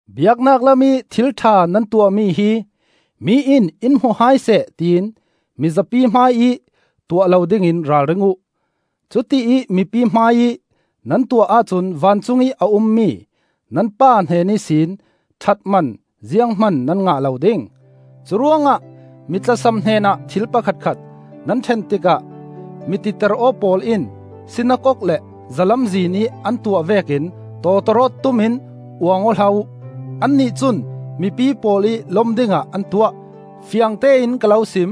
“Biaknak lamih thil ṭha nan tuahmi hi mi in in hmu hai seh tiin mizapi hmaiih tuah lo dingin ralring uh. Cutiih mipi hmaiih nan tuah ahcun vancungih a ummi nan Pa hnen ihsin ṭhatman ziang hman nan ngah lo ding. “Curuangah mi tlasam hnenah thil pakhatkhat nan ṭhen tikah mititeraw pawl in sinakok le zalamzin ih an tuah vekin tawtawrawt tum in uang aw hlah uh. Annih cun mipi pawl ih lom dingah an tuah. Fiangtein ka lo sim: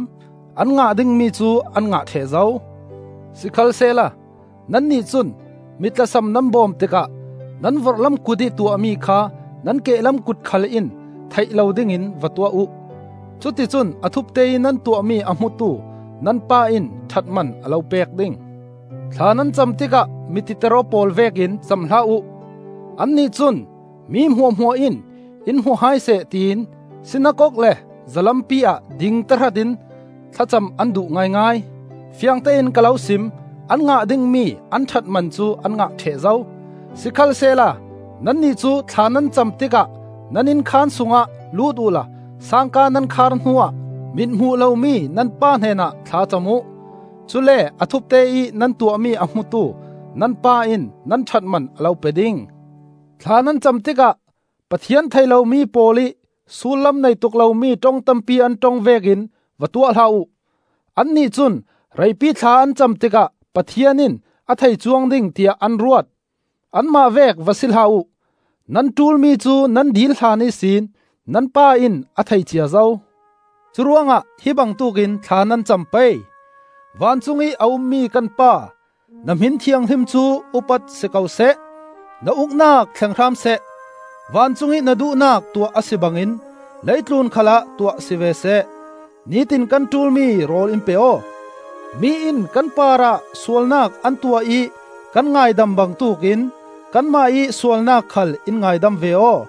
an ngah dingmi cu an ngah ṭheh zo. Sikhalsehla nannih cun mi tlasam nan bawm tikah nan vorhlam kut ih tuahmi kha nan kehlam kut khal in theih lo dingin va tuah uh. Cuticun a thupte ih nan tuahmi a hmutu nan Pa in ṭhatman a lo pek ding. “Thla nan cam tikah mititeraw pawl vekin cam hlah uh. Annih cun mi hmuahhmuah in in hmu hai seh tiin sinakok le zalampi ah ding tahratin thlacam an duh ngaingai. Fiangtein ka lo sim: an ngah dingmi an ṭhatman cu an ngah ṭheh zo. Sikhalsehla nannih cu thla nan cam tikah nan innkhaan sungah lut uhla sangka nan khar hnuah mithmuh lomi nan Pa hnenah thla cam uh. Cule a thupte ih nan tuahmi a hmutu nan Pa in nan ṭhatman a lo pe ding. “Thla nan cam tikah Pathian thei lomi pawl ih sullam nei tuk lomi ṭong tampi an ṭong vekin va tuah hlah uh. Annih cun reipi thla an cam tikah Pathian in a thei cuang ding tiah an ruat. Anmah vek va si hlah uh. Nan ṭulmi cu nan dil hlan ihsin nan Pa in a thei cia zo. Curuangah hi bangtuk in thla nan cam pei: ‘Vancung ih a ummi kan Pa, na hmin thianghlim cu upat si ko seh; Na Uknak thleng hram seh; Vancung i na duhnak tuah a si bangin leitlun khalah tuah si ve seh. Nitin kan ṭulmi rawl in pe aw. Mi in kan parah sualnak an tuah ih kan ngaidam bangtuk in, Kanmah ih sualnak khal in ngaidam ve aw.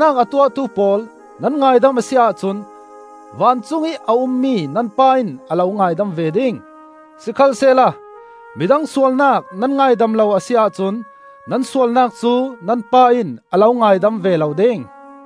“Nan parah sualnak a tuahtu pawl nan ngaidam a si ahcun vancungih a ummi nan Pa in a lo ngaidam ve ding. Sikhalsehla midang sualnak nan ngaidam lo a si ahcun nan sualnak cu nan Pa in a lo ngaidam ve lo ding.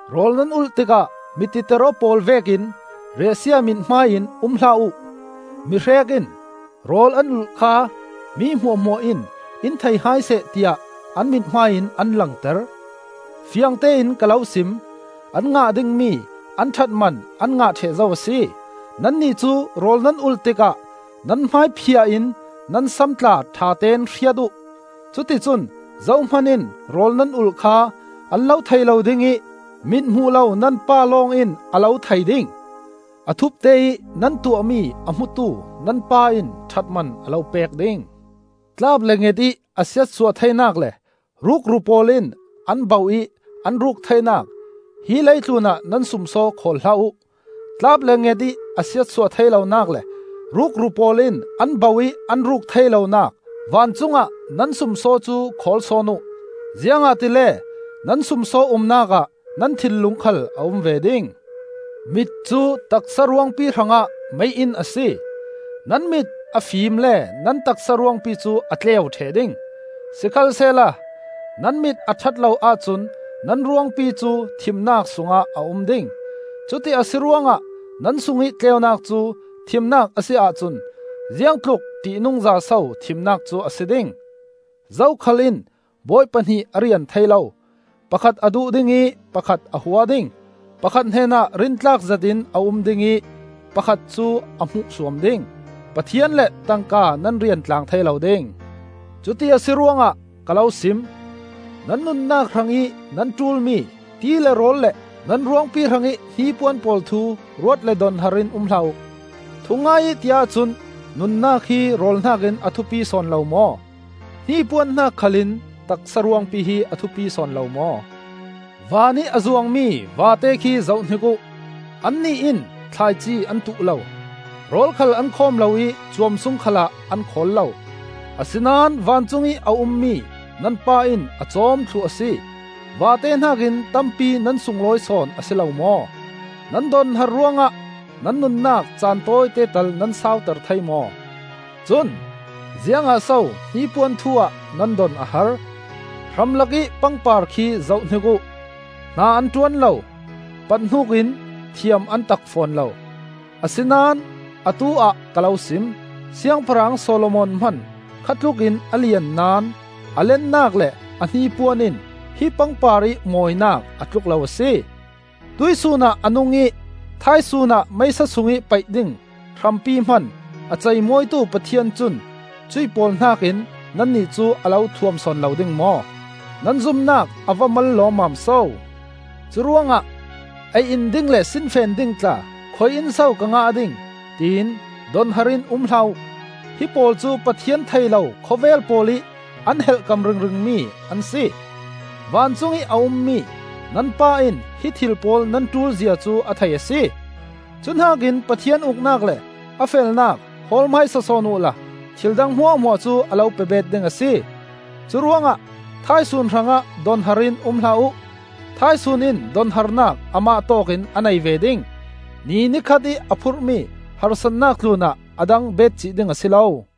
“Rawl nan ulh tikah mititeraw pawl vekin riahsia mithmai in um hlah uh. Mihrek in rawl an ulh kha mi hmuahhmuah in in thei hai seh tiah an mithmai in an langter. Fiangtein ka lo sim: an ngah dingmi an ṭhatman an ngah ṭheh zo a si. Nannih cu rawl nan ulh tikah nan hmai phiah in nan sam tla ṭhatein hriat uh. Cuticun zohman in rawl nan ulh kha an lo thei lo ding ih mithmuh lo nan Pa lawng in a lo thei ding. A thupte ih nan tuahmi a hmutu nan Pa in ṭhatman a lo pek ding. “Tlap le nget ih a siatsuah theinak le rukru pawl in an bauh ih an ruk theinak hi leitlun ah nan sumsaw khawl hlah uh. Tlap le nget ih a siatsuah thei lonak le rukru pawl in an bauh ih an ruk thei lonak vancung ah nan sumsaw cu khawl sawn uh. Ziangahtile nan sumsaw umnak ah nan thinlung khal a um ve ding. “Mit cu taksa ruangpi hrangah mei-inn a si. Nan mit a fim le nan taksa ruangpi cu a tleu ṭheh ding. Sikhalsehla nan mit a ṭhat lo ahcun nan ruangpi cu thimnak sungah a um ding. Cuti a si ruangah nan sungih tleunak cu thimnak a si ahcun ziangtluk ṭihnungza so thimnak cu a si ding! “Zokhal in bawi pahnih a rian thei lo. Pakhat a duh ding ih pakhat a hua ding. Pakhat hnenah rintlak zetin a um ding ih pakhat cu a hmuhsuam ding. Pathian le tangka nan rian tlang thei lo ding. “Cuti a si ruangah ka lo sim: nan nunnak hrangih nan ṭulmi ti le rawl le nan ruangpi hrangih hnipuan pawl thu ruat le donhar in um hlah uh. Thungai ih ti ahcun, nunnak hi rawl hnakin a thupi sawn lo maw? Hnipuan hnak khal in taksa ruangpi hi a thupi sawn lo maw? Van ih a zuangmi vate khi zohhnik uh; annih in thlaici an tuh lo, rawl khal an khawm lo ih cuam sung khalah an khawl lo. Asinain vancungih a ummi nan Pa in a cawm thluh a si. Vate hnakin tampi nan sunglawi sawn a si lo maw? Nan donhar ruangah nan nunnak caan tawite tal nan sauter thei maw? “Cun ziangah so hnipuan thu ah nan don a har? Hramlakih pangpar khi zohhnik uh; hna an ṭuan lo, pathnuk in thiam an tak fawn lo. Asinain atu-ah ka lo sim: siangpahrang Solomon hman, kha tlukin a lian naón, a lennak le a hnipuan in hi pangpar ih mawinak a tluk lo a si. Tuihsun ah a nung ih thaisun ah meisa sungih paih ding hrampi hman a ceimawitu Pathian cun cuih pawl hnakin nannih cu a lo thuam sawn lo ding maw? Nan zumnak a va mal lawmmam so! “Curuangah ‘Ei in ding le sinfen ding tla khui-in so ka ngah ding,’ tiin donhar in um hlah uh. Hi pawl cu Pathian thei lo khawvel pawl ih an helhkam ringring mi an si. Vancung ih a ummi nan Pa in hi thil pawl nan ṭulzia cu a thei a si. Cuhnakin Pathian Uknak le a felnak hawl hmaisa sawn uhla thil dang hmuahhmuah cu a lo pebeet ding a si. Curuangah thaisun hrangah donhar in um hlah uh; thaisun in donharnak amah tawkin a nei ve ding. Ni ni khat ih a phurhmi harsatnak tlunah a dang beetcih ding a si lo.